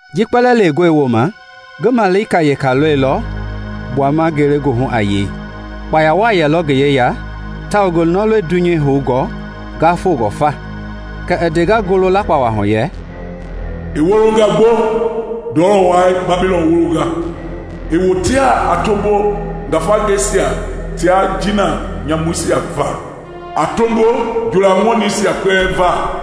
Ji kpɛlɛɛ lewengɔ wooma ngi malika weka lɔilɔ gbuama ngelegoohu a yei. Kpaya wa yelɔ ngi yeya tawao ngi nɔlɛi dunyei houngɔ ngafongɔ fa. Kɛ i ndenga ngoo lakpawa hu yɛ, “I wolonga gbo, ndɔlɔ wai Babilɔn wolonga! I wotea a tombo ngafangeisia tia jiina nyamuisia va, a tombo njoola ŋɔningɛisia kpɛlɛɛ va.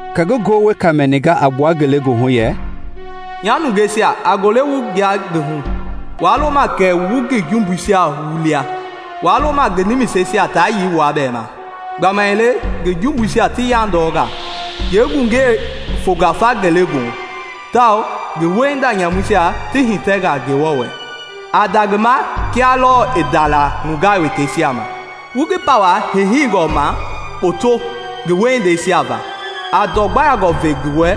Kɛ ngi ngoo weka mɛninga a gbua ngelegoohu yɛ, “Nya nungeisia, a gule wu gbua ngi hu! Waa loma kɛ wu ngi jumbuisia wulia; waa loma ngi nimisesia taa yei wua bɛɛ ma! Gbamaile ngi jumbuisia ti yandɔnga yeegungei fonga fa ngelegoohu, tawao ngi wiehinda nyamuisia ti hitɛnga Ngewɔ wɛ. A nda ngi ma kia lɔɔ i ndaila nungaa wekeisia ma; wu ngi pawa heiheingɔ ma kpoto ngi wiehindeisia va. A ndɔ gbayangɔ ve ngi wɛ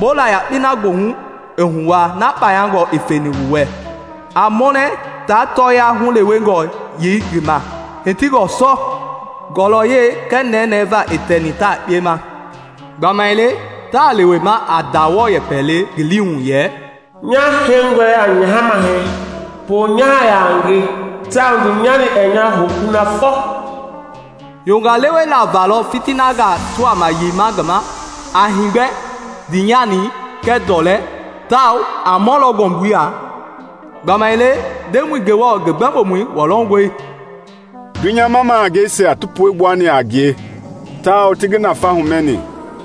bola yakpei na goohu i huwaa na kpayangɔ i feni wu wɛ. A mɔnɛ ta tɔɔya hulewengɔ yei ngi ma hitingɔ sɔ ngɔlɔyɛi kɛɛ nɛnɛɛ va i tɛni tayekpe ma. Gbamaile ta lewema a ndawɔɔ yɛpɛ le ngi liihu yɛ: ‘Nyaa heingɔi a nyaha mahɛi! Poonyaha yaa nge, tao ndiinyani ɛɛ nya hou kunafɔ!’ Yonga lewela valɔ fitinangaa ti wama yeima ngi ma a heegbɛ, ndiinyani, kɛɛ ndɔlɛi, Tawao a mɔlɔ ngɔmbui ya, gbamaile Ndemɔi Ngewɔ ngi gbɛmbomɔi, wɔlɔngɔi.” Dunyama mahangeisia ti puegbuani a ngie tawao ti ngi nafa humɛni,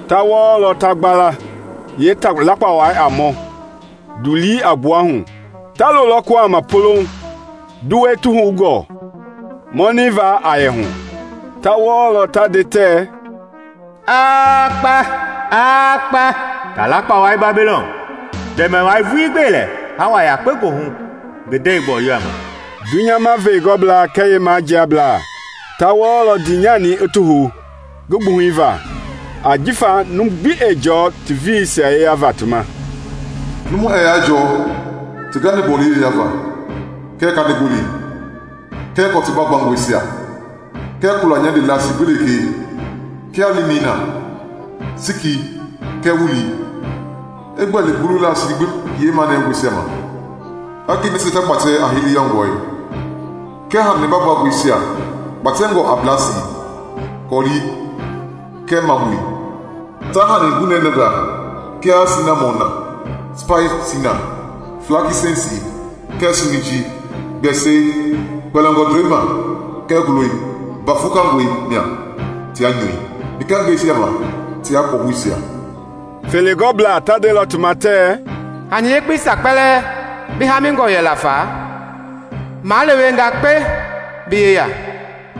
ta wɔɔlɔ ta gbala ji taalakpawai a mɔ ndulii a gbuahu. Ta loolɔ kuhama polouŋ nduwɛi ti houngɔ mɔnɛi va a yɛ hu, ta wɔlɔ ta nde tɛ, “Aa kpa! Aa kpa, taalakpawai Babilɔn, ndɛmɛwai vuii gbelɛ hawa yakpe googu ngi nde gbɔyɔa ma!” Dunyama veegɔblaa kɛɛ yeemajiablaa ta wɔɔlɔ ndiinyani i ti hou ngi gbuhɛi va, ajifa numu gbi ɛɛ jɔɔ ti veeisia yeya va ti ma; numu ɛɛ yaa jɔɔ ti ganigbɔli yeya va, kɛɛ kanigolei, kɛɛ kɔtu baagbangɔisia, kɛɛ kula nyande lasi gbi lekee, kia linii na, siki kɛɛ wulii; i gbɛli ngulu lasi gbi yeemagunɛngɔ ma, hakei nasia ta kpatɛ a heleyɔngɔi, kɛɛ hani baagbangɔisia kpatɛngɔ a blasi, kɔlii, kɛɛ mabui; taa hani gunɛnɛngaa kia sinamɔn na, spaisi na, flakinsɛnsi kɛɛ siminjii, gbɛsɛi, kpɛlingɔ ndoe ma kɛɛ ngulɔi, mba vukangɔi ma tia nyui, nikangɛisia ma tia kɔhousia. Feegɔblaa ta ndelɔ ngi ma tɛ, “Hani yekpeisia kpɛlɛɛ bi hamingɔ yɛla fa malewenga kpe bi yeya,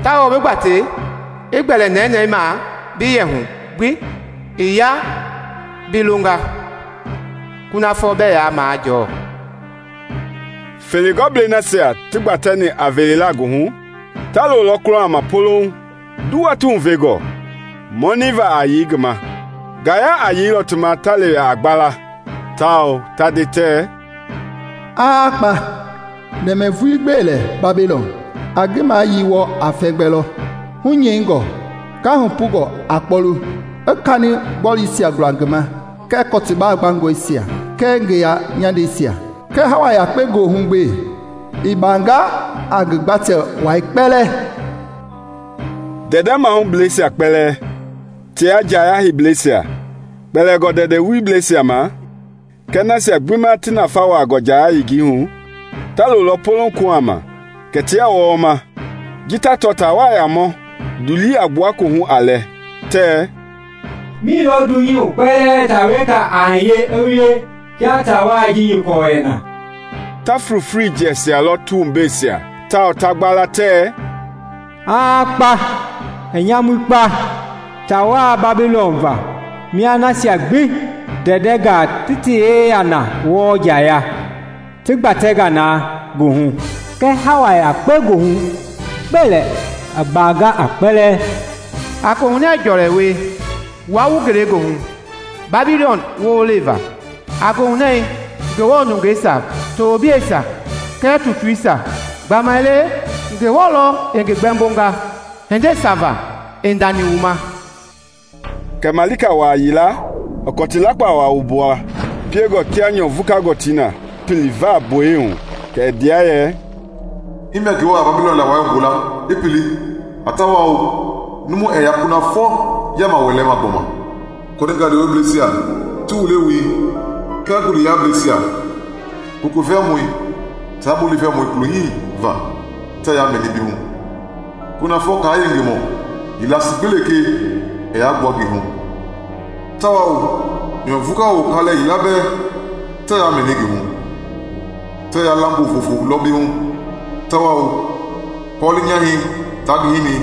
tawao bi gbatei i gbɛli nɛnɛɛ ma bi yɛ hu gbii ya bi longa kunafɔ bɛɛ yaa ti majɔɔ!” Feegɔblei nasia ti gbatɛni a veela ngi hu ta loolɔ kuhama polouŋ nduwa ti huvengɔ mɔnɛi va a yei ngi ma. Ngaya a yeilɔ ti ma ta lewe a gbala, tao ta nde tɛ, “Aa kpa! Ndɛmɛ vuii gbelɛ Babilɔn! A ngi mayili wɔɔ a fɛmgbɛ lɔ, hunyɛingɔ ngahunpungɔ a kpɔlu, i kani gbɔluisia gula ngi ma kɛɛ kɔti baagbangɔisia kɛɛ ngeya nyandeisia! Kɛɛ hawa yakpe goohu gbe, i baanga a ngi gbatɛ wai kpɛlɛɛ!” Ndɛndɛ mahubleisia kpɛlɛɛ tia njaya heibleisia, kpɛlingɔ ndɛndɛ wulibleisia ma kɛɛ nasia gbi ma ti nafɛi wuaangɔ njaya yengei hu ta loolɔ polouŋ kuhama, kɛ tia wɔɔma ji ta tɔ taawai a mɔ ndulii a gbua koohu a lɛ, tɛ, “Milɔ dunyei hu kpɛlɛɛ taa weka wa a hiye i wie kia tawai ji nyɔkɔ yɛ na?” Ta flofloi jɛsialɔ ti wumbeisia, ta wɔɔ tao ta gbala tɛɛ, “Aa kpa! I nyamui kpa taawai Babilɔn va mia nasia gbi ndɛndɛngaa ti ti yeya na wɔɔ njaya ti gbatei na ngi hu! Kɛɛ hawa yakpe goohu gbelɛ i baanga a kpɛlɛɛ!” A koohunɛɛ jɔlɛ wie, wua wu ngelegoohu, Babilɔn wololei va! A goohunɛɛ Ngewɔ nungeisia, tobleisia, kɛɛ tutuisia! Gbamaile Ngewɔ lɔ i ngi gbɛmbonga hindeisia va i ndani wu ma! Kɛ malika wa yila i kɔti lakpawa wumbua piengɔ kia nyɔ vuka gɔtii na, i pili vaa gboyei hu kɛ i ndea yɛ, “Himia Ngewɔ a Babilɔn lawai wumbula i pili a tawao numu ɛɛ yaa kunafɔ yaama wɛlɛma gbɔma. Kɔninga lewebleisia ti wule woi kɛɛ guleyaableisia, koko vɛwoi taa bulii vɛwoi kulo hii va tɛɛ yaa mɛni bi hu. Kunafɔ kaa yenge wiemɔ yeelasii gbi lekee ɛɛ yaa gbua ngi hu, tawao nyɔ vukawo kalɛ yila bɛɛ tɛɛ yaa mɛni ngii hu! Tɛɛ yaa lambo vofo lɔ bi hu, tawao kɔli nyahɛi taa ngi hini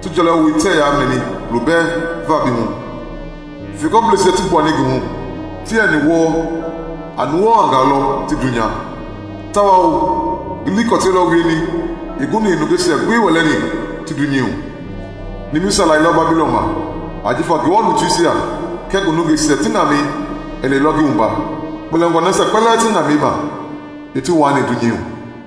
ti jɔlewoi tɛɛ yaa mɛni kulo bɛɛ va bi hu. Feegɔbleisia ti gbuani ngi hu ti yɛni wɔɔ a nuwawangaa lɔ ti dunya, tawao ngi likɔtɛi lɔ wieni i guni i nungeisia gbi wɛlɛni ti dunyei hu.” Nimisa lailɔ Babilɔn ma ajifa Ngewɔ lutuisia kɛɛ ngi nungeisia ti ŋamɛi i lɛilɔ ngi wumba, kpɛlingɔ nasia kpɛlɛɛ ti ŋamɛi ma i ti waani dunyei hu.